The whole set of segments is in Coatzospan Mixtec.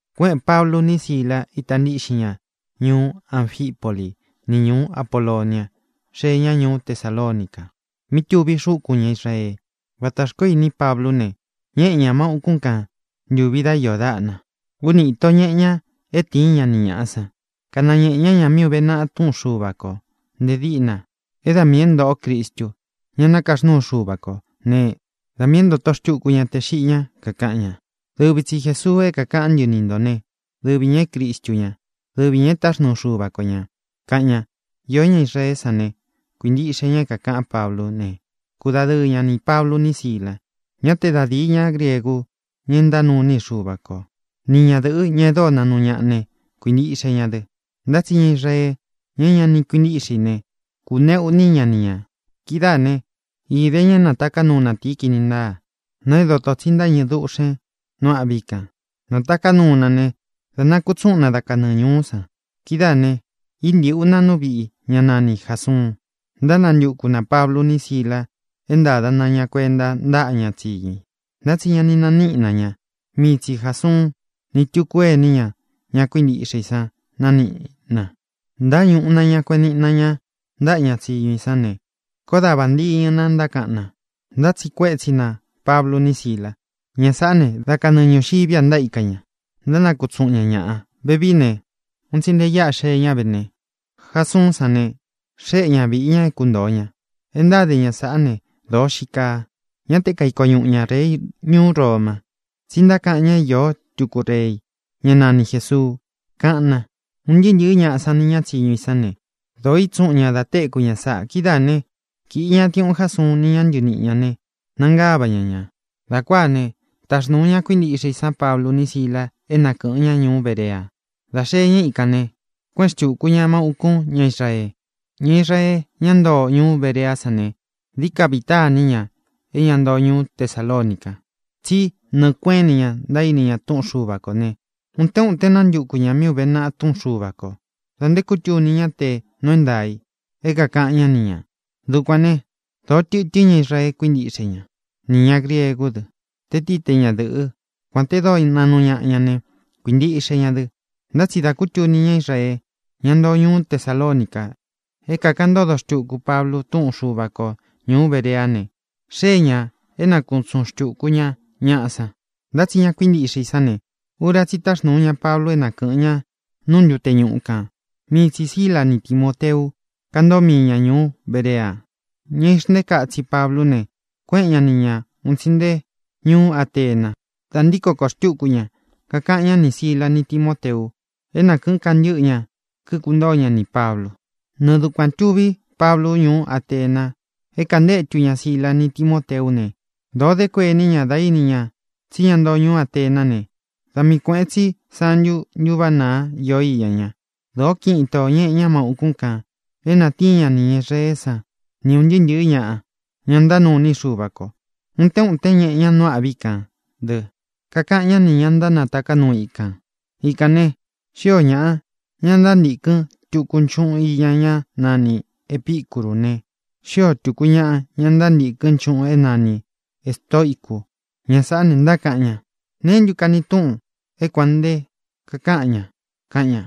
Kuéꞌēn Pablu ni Sílā, ita ntíꞌxin ña ñuú Anfipoli ni ñūú Apolonia, xée ña ñūú Tesalonica, mí tuví xúkūn ña Israee. Vata xkoó ini Pablú ne, ñéꞌe ñā má ūkún kan ntūvi dá iō dáꞌna. Úni īto ñeꞌe ña é tiín ña ni ñāꞌa san, kanañēꞌe ña ña mí uve naꞌa Túꞌun Xuva kō nte díꞌna é da miī é ntōꞌo Cristu, ña nakaxnúu Xuva kō ne, da miī é ntotō xtuku ña te xiꞌi ña. Kakaꞌan ña: —Dɨvi tsi Jēsuu é kākaꞌán ntɨ ni ntō né, dɨvi ñā é Cristu ñá, dɨvi ñā é taxnuu Xuva ko ñā —kaꞌan ña. Iō ñá Israeé san ne, kuīntiꞌxe ña é kākaꞌan Páblu ne, kúdadɨɨ ñá nī Pablu ni Sílā. Ñá te da dīi ñá griegu, ña é ntánuu iní i Xuva ko, ni ñadɨ̄ꞌɨ, ña e dóo naꞌnu ñaꞌa ne, kuīntiꞌxe ña dɨ. Ntá tsi ña Israee, ña é ña ni kuintíꞌxe i ne, kūneꞌu iní ña ni ñā. Kidáā né, īde ña é nātaká nuu natīi kini ntáa, na é dotō tsí ntáñɨ̄ dúꞌxen nu âꞌví kān. Nātaká nuu na ne, dā nakutsúꞌun na da kanɨɨ ñūú san. Kidáā ne, íntīꞌu na nú viꞌi ña nani Jāsuun, ntánantuku nā Pablu ni Sílā é ntāda na ña kuenta ntáꞌa ña tsíñu i. Ntá tsi ña ni naníꞌi na ña. Mii tsi Jāsuun, ni túku ení ña, ña kuíntiꞌxe i san naníꞌi na. Ntáñūꞌu na ña, kueꞌen niꞌi na ña ntaꞌa ña tsíñu i san ne, koó da vāntiñɨ na ntákaꞌan na, ntátsiꞌi kuétsi nā Pablu ni Sílā: —Ña sāꞌá ne, da kanɨɨ ñūxiví a ntaíka ña, ntánakutsúꞌun ña ñāꞌa. Vevií ne, un tsi nte íꞌa xee ñá ve ne, Jasuún san ne, xéꞌe ña vīꞌi ña é kuntōo ña. E ntáde ña sáꞌa ne, dōo xíi kaa. Ñá te kaiko ñuꞌu ña rei ñuú Roma, tsí ntákaꞌan ña é iō túku rei, ñá nani Jēsuu —kaꞌan na. Un ntɨɨ́ ntɨ̄ɨ́ ñaꞌa san ni ña tsíñu i san ne, dōo ítsuꞌun ña da téku ña sáꞌa. Kidáā né, kīꞌi ña diuꞌun Jásuun ni ña ntɨɨ níꞌi ña ne, nangáva ña ñā. Dā kuáa ne, táxnūu ña kuíntiꞌxe i san Pablu ni Sílā é na kɨ̄ꞌɨn ñá ñuú Berea. Dā xee ñá ikān ne, kuéꞌen xtūku ña má ūkún ña Israee. Ña Israee, ñá ntoo ñuú Bereá san ne, dií ka vita ini ña é ña ntoo ñuú Tesalonica, tsí nɨɨ̄ kueꞌén ini ña ntaíni ña Túꞌun Xuva kō ne, utén uten nántuku ñā mí ūve naꞌa Túꞌun Xuva kō da nté kutuni ñá tē nuu é ntaā i é kākaꞌan ñá ni ñā. Dukuan ne, dōó tɨtɨ́n ña Israee kuíntiꞌxe ña, nī ña griegú dɨ, tē tií te ñadɨ̄ꞌɨ́, kuān te dóo naꞌnu ñaꞌa ña ne, kuīntiꞌxe ña dɨ. Ntá tsi dā kútuni ñá Israee, ñá ntoo ñuú Tesalonica, é kākaꞌan ntódo xtuku Pablu túꞌun Xuva ko ñūú Bereá ne, xée ñā é nakutsuꞌun xtūku ña ñaꞌa san. Ntá tsi ña kuíntiꞌxe i sán ne, ura tsí i táxnūu ña Pablu é na kɨ̄ꞌɨn ña nu ntute ñuꞌu kan. Mii tsī Síla ni Timōteu kántoo mii ña ñūú Berea. Ña ixntéka itsi Pablú ne, kuéꞌen ña ni ñā un tsi nte ñuú Atena. Dā ntíko kōo xtúku ña, kakaꞌan ñá nī Síla ni Timōteu é na kɨ̄ꞌɨn kantɨ́ꞌɨ ña, kíkuntóo ña nī Pablu. Nɨɨ dukuān tuví Pablu ñuú Atena é kantétu ña Síla ni Timōteú ne, dōo dé kuení ña dá īni ña tsí ña ntoo ñuú Atená ne, da miī kueꞌen tsi sántu ntūváꞌa naa íō iña ña. Dōó kiꞌin itō ñeꞌe ña má ūkún kān é natíin ña nī ña Israeé san ni ūn ntɨɨ́ ntɨ̄ɨ́ ñaꞌa, ña ntánuu iní i Xuva kō. Utén utén ñeꞌe ña nu âꞌví kān dɨ́, kakaꞌan ñá nī ña ntánataká nuu ikān. Ikān ne, xíō ñaꞌa, ña ntántīkɨn túku nchuꞌun iña ñá nani Epīcurú ne, xíō túku ñaꞌa, ña ntántīkɨ́n nchuꞌun é nani ēstoicu. Ña sāꞌá ne, ntákaꞌan ña: —¿Neé ntu kani túꞌun é kuān nte kakáꞌan ña? —kaꞌan ña.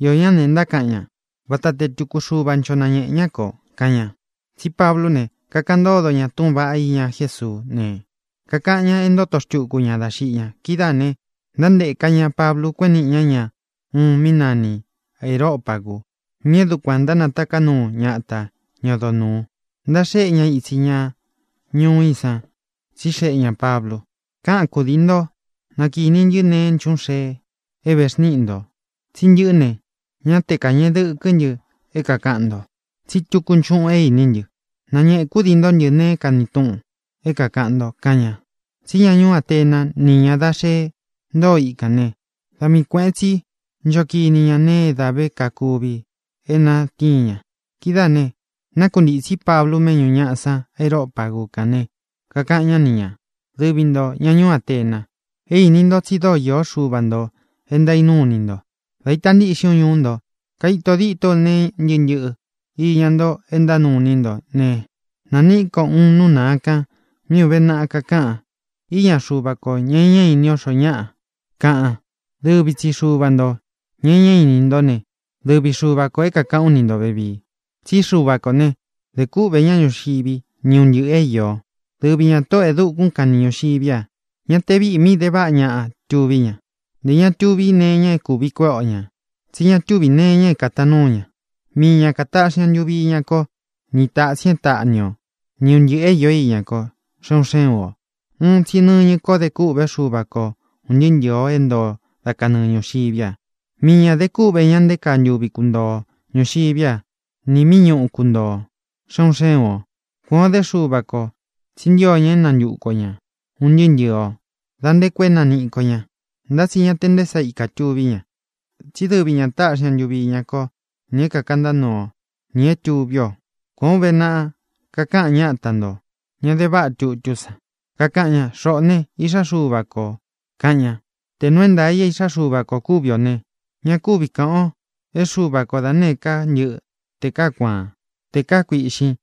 Íō ñá ne, ntákaꞌan ña: —Vata tē é tūkú xuva ncho nañeꞌē ñá kō —kaꞌan ña. Tsí Pablú ne, kakaꞌan ntódo ña túꞌūn vaꞌá iña Jésuú ne, kakaꞌan ñá e ntóto xtuku ña dá xiꞌi ña. Kidáā ne, ntánteka ñā Pablu, kueꞌen níꞌi ña ña uun mí nani Areōpagu, mí é dukuān ntánataká nuu ñata ña odo nūu, ntaxéꞌe ña itsi ña ñuú i san. Tsixeꞌe ñā Pablu: —Káꞌan kūdii ntó, na kīni ntɨ neé nchuꞌun xee é vexníꞌi ntō. Tsí ntɨꞌɨ́ ne, ñá te kāñeꞌe dɨkɨ́ ntɨ é kākaꞌan nto, tsí tuku nchuꞌun é iní ntɨ. Nañēꞌe kudii ntó ntɨ nee é kani túꞌun é kākaꞌan nto —kaꞌan ña. Tsí ña ñuú Atena ni ña da xee ntóo ikān né, da mii kuēꞌen tsi nchó kini ña nee é dā ve kakuvi é natíin ña. Kidáā ne, nákuntītsí Pablu méꞌñū ñaꞌa san Areopagu kán ne, kakaꞌan ñá ni ñā: —Dɨvi ntō, ña ñuú Atena, é īní u tsí dōó īó xuva ntō e ntánuu iní nto. Dā ítā ntiꞌxin ú ñuú nto, kaito dîtó u nee ntɨ́ꞌɨ ntɨꞌɨ iña nto e ntánuu iní nto ne, nāniꞌí ko uun nú naa kan mí ūve naꞌa kakaꞌan: “Iña xúva kō, ña e ñá ini o xoo ñáꞌa”, kaꞌan. Dɨvi tsi xuva ntō, ña e ñá ini ntó ne, dɨvi Xuva kō é kākaꞌán u ni ntō vevii. ʼTsí Xuva kō né, dē kúꞌvē ñá ñuxiví ni un ntɨꞌɨ̄ é īo. Dɨvi ñā Tóꞌō e dukún kan ni ñūxiví a. Ña te víꞌī mí de váꞌa ñaꞌa tuví ña. Nté ña túvi nee iña é kūvi kuéꞌe o ñā, tsí ña tuví nee iña é kātaan núu ña. Mii ña kātaꞌxi ña ntuvi iña ko ni tatsin é taꞌni o, ni un ntɨꞌɨ̄ é īó iña ko, xe un xé un ō. ʼUun tsi nɨñɨ ko dé kûꞌvé Xuva ko un ntɨɨ́ ntɨɨ̄ o é ntoo o da kanɨɨ ñūxiví a. Mii ñā de kúꞌvē ña nté kaa ntuvi kuntoo o ñūxiví a nī míꞌi ñūú kuntoo o, xe un xé un ō. Kuān o dé Xuva kō, tsi ntío ña é nantuku o ñā, un ntɨɨ́ ntɨɨ̄ o, da nté koo é naniꞌí ko ña. Ntá tsi ña te nté sa ikā tuví ña, tsí dɨvi ña taꞌxi ña ntuvi iña ko, nī é kakantá nuu o, nī é tuví ō. Kuān ó uve naꞌa, kakaꞌan ñáta ntō, ña de váꞌa tutú san, kakaꞌan ña: “Xoꞌō ne, iꞌxá Xuva ko ō”, kaꞌan ña. Tē nuu é ntaā i é īꞌxá Xuva kō kúvi ō ne, ña kúvi kāꞌan o é Xuva ko da nēé ka ntɨꞌɨ, tē kaá kuaan, tē kaá kuīꞌxín,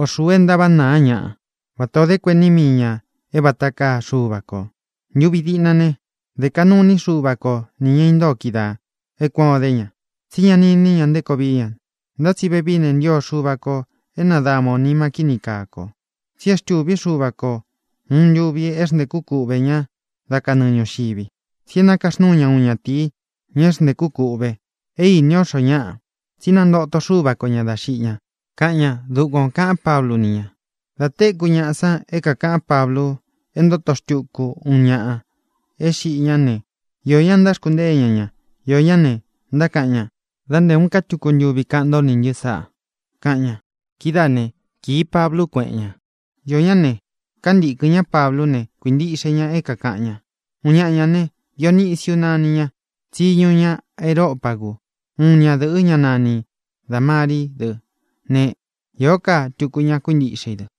o xuu e ntávaꞌa naa ñaꞌa vata ō dé kuení mii ña é vata kaa Xuva kō. Ntuvi diꞌna ne, dé kaꞌnu iní Xuva ko nī ña intóo kídaā e kuán o dé ña, tsí ña ni iní ña nté koo vií ña. Ntá tsi vevií ne, ntio Xuva kō é nadama ō nima kíni kaa ko. Tsi e xtûví Xuva ko ūun ntuvi é xntēkú kuꞌvē ñá da kanɨɨ ñūxivi. Tsí é nakaxnúu ña uun ñatīi, ña é xntēku kûꞌve. É īni ó xoo ñáꞌa, tsí nantóto Xuva ko ñā dá xiꞌi ña —kaꞌan ña. Dukuan ō kaꞌán Pablu ni ña. Dā téku ñaꞌa san é kākaꞌán Pablu é ntóto xtuku uun ñaꞌa é xiꞌi ñá ne, iō ña ntáxkuntée ña ña. Iō ñá ne, ntákaꞌan ña: —Dá nte ūun ká tuku ntuvi kaꞌan ntó nī ntɨ́ sáꞌa —kaꞌan ña. Kidáā né, kīi Pablu, kuéꞌen ña. Iō ñá ne, kantīkɨn ñá Pablú ne, kuīntiꞌxe ña é kākaꞌan ña. Uun ñaꞌa ñā ne, Dionisiu náni ña; tsiñu ña Areopagu. Uun ñadɨ̄ꞌɨ́, ña nani Dāmarí dɨ ne, īó ka tuku ñaꞌa kuíntiꞌxe i dɨ.